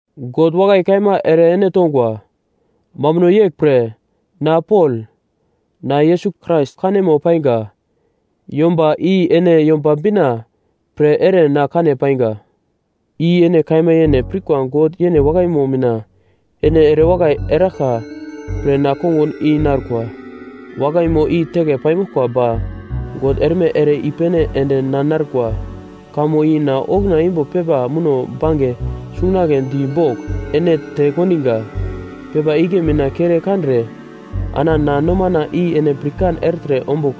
God wakai kaima ere ene tongwa, mambuno yeglpre, na Pol, na Yesus Krais kanemo painga yomba, i ene Yomba Bina pre ere na kane paiga. I ene kaima yene pirkwa God yene wakaimo mina ene erewakai eraglka pre na kongun i narkwa. Wakaimo i teke paimoglkwa ba God erme ere i-pene ende na narkwa, kamo i na okuna imbo pepa muno bange sungagle di bogl ene te kondiga. Pepa igle mina kere kandre ana na nomana i ene pirkan ertre ombugl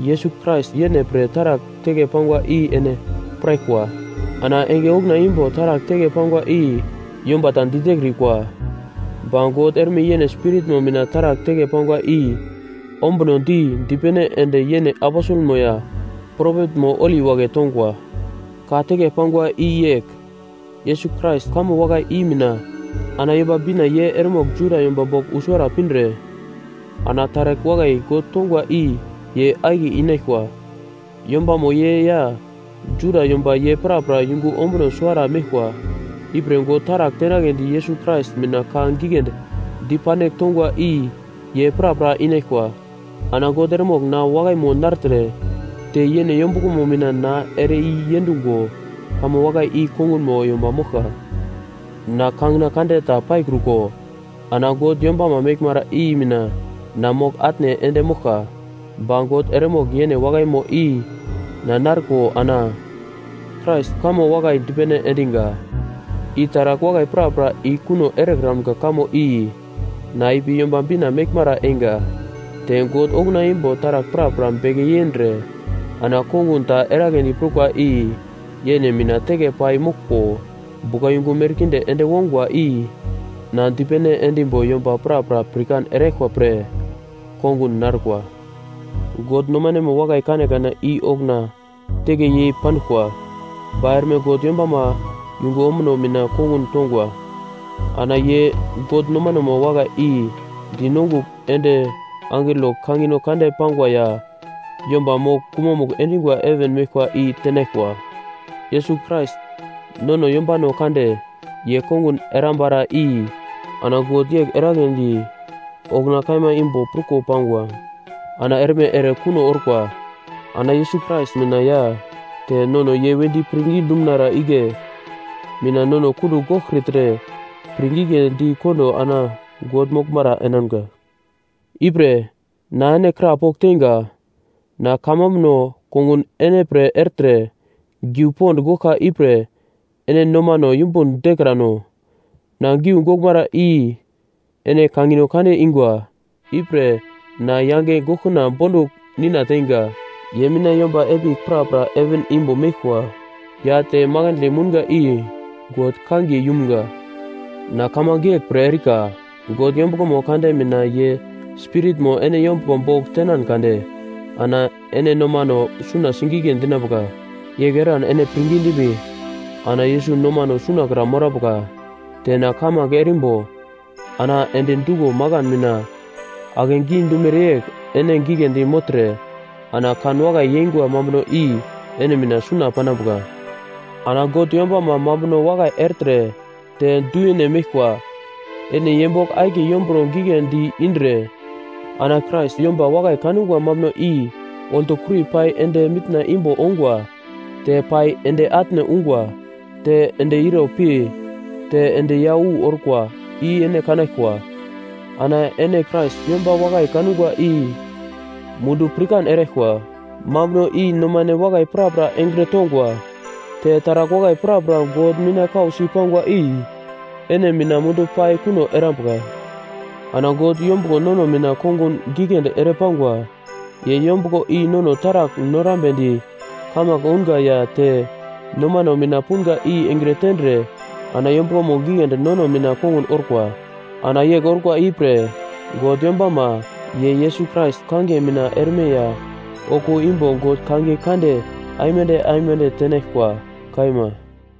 Yesus Krais yene pre taragl teke pangwa i ene piraglkwa. Ana enge okuna imbo taragl teke pangwa i yomba ta ditekrikwa, ba God erme yene Spiritmo mina taragl teke pangwa i ombunodi dipene ende yene aposelmo ya propetmo holi wagle tongwa. Ka teke pangwa i yegl, Yesus Krais kamo wakai i mina ana Yomba Bina ye eremogl Juda yomba bogl wu suwara pindre ana taragl wakai God tongwa i ye akiye inaglkwa. Yombamo ye ya Juda yomba ye prapra yungu ombuno suwara meglkwa, ipre God taragl tenagledi Yesus Krais mina ka giglendi dipandigl tongwa i ye prapra inaglkwa. Ana God eremogl na wakaimo nartre te yene yombuglomo mina na ere i yendungo kamo wakai i kongunmo yomba moglka. Na kangina kande ta paikruko ana God yombama meglmara i mina na mogl-atne ende moglka, ba God eremogl yene wakaimo i na narko ana Krais kamo wakai dipene endiga i taragl wakai prapra i kuno erekramga kamo i na ipi Yomba Bina meglmara einga, te God okuna imbo taragl prapra beke yendre ana kongun ta eragledi prukwa i yene mina teke pai moglko buglayungu merkinde ende wongwa i na dipene endimbo yomba prapra pirkan eraglkwa pre kongun narkwa. God nomanemo wakai kanekane i okuna teke yei panduglkwa, ba erme God yombama yungu ombuno mina kongun tongwa. Ana ye God nomanemo wakai i di nongugl ende angelo kangino kande pangwa ya yomba mogl gumamugl endingwa heven meglkwa i tenaglkwa. Yesus Krais, nono yombano kande, ye kongun erambara i ana God yegl eragledi okuna kaima imbo pruko pangwa, ana erme ere kuno orkwa. Ana Yesus Krais mina ya te nono ye wedi pirngi dumunara igle mina nono kundugl goglkritre pirngigledi kondo ana God moglmara enamga. Ipre, na ene krapogl teinga, na kamambuno kongun ene pre ertre giu pond goglka ipre ene nomano yumbun dekrano, na giu goglmara i ene kangino kande ingwa. Ipre, na yange goglkuna bondugl Nina teinga, ye mina yomba epigl prapra heven imbo meglkwa ya te makandle mounga i God kangiye yumga. Na kamange yegl pre erika God yombuglomo kande mina ye Spiritmo ene yombuglo bogl tenan kade, ana ene nomano suna sigigle dinambuka. Yegl eran ene pirngi dimbi ana Yesus nomano sunakra morambuka. Te na kamange erimbo ana endi duglo makan mina akegi dumere yegl ene giglendi mogltre ana kan wakai yeingwa mambuno i ene mina suna panambuka. Ana God yombama mambuno wakai ertre te du yene meglkwa, ene ye bogl akiye yomburo giglendi indre ana Krais yomba wakai kangwa mambuno i oltokuri pai ende mitna imbo ongwa, te pai ende atne ungwa, te ende ire pi te ende ya wu orkwa, i ene kanaglkwa, ana ene Krais yomba wakai kangwa i mundu pirkan eraglkwa, mambuno i nomane wakai prapra engre tongwa. Te taragl wakai prapra God mina kausi pangwa i ene mina mundu pai kuno erambuka. Ana God yombuglo nono mina kongun giglendi ere pangwa. Ye yombuglo i nono taragl norambedi kamange ounga ya te nomano mina punga i engre tendre ana yombuglomo giglendi nono mina kongun orkwa. Ana yegl orkwa i pre, God yombama, ye Yesus Krais kangiye mina erme ya okuwo imbo God kangiye kande aimande aimande tenaglkwa! Kaima.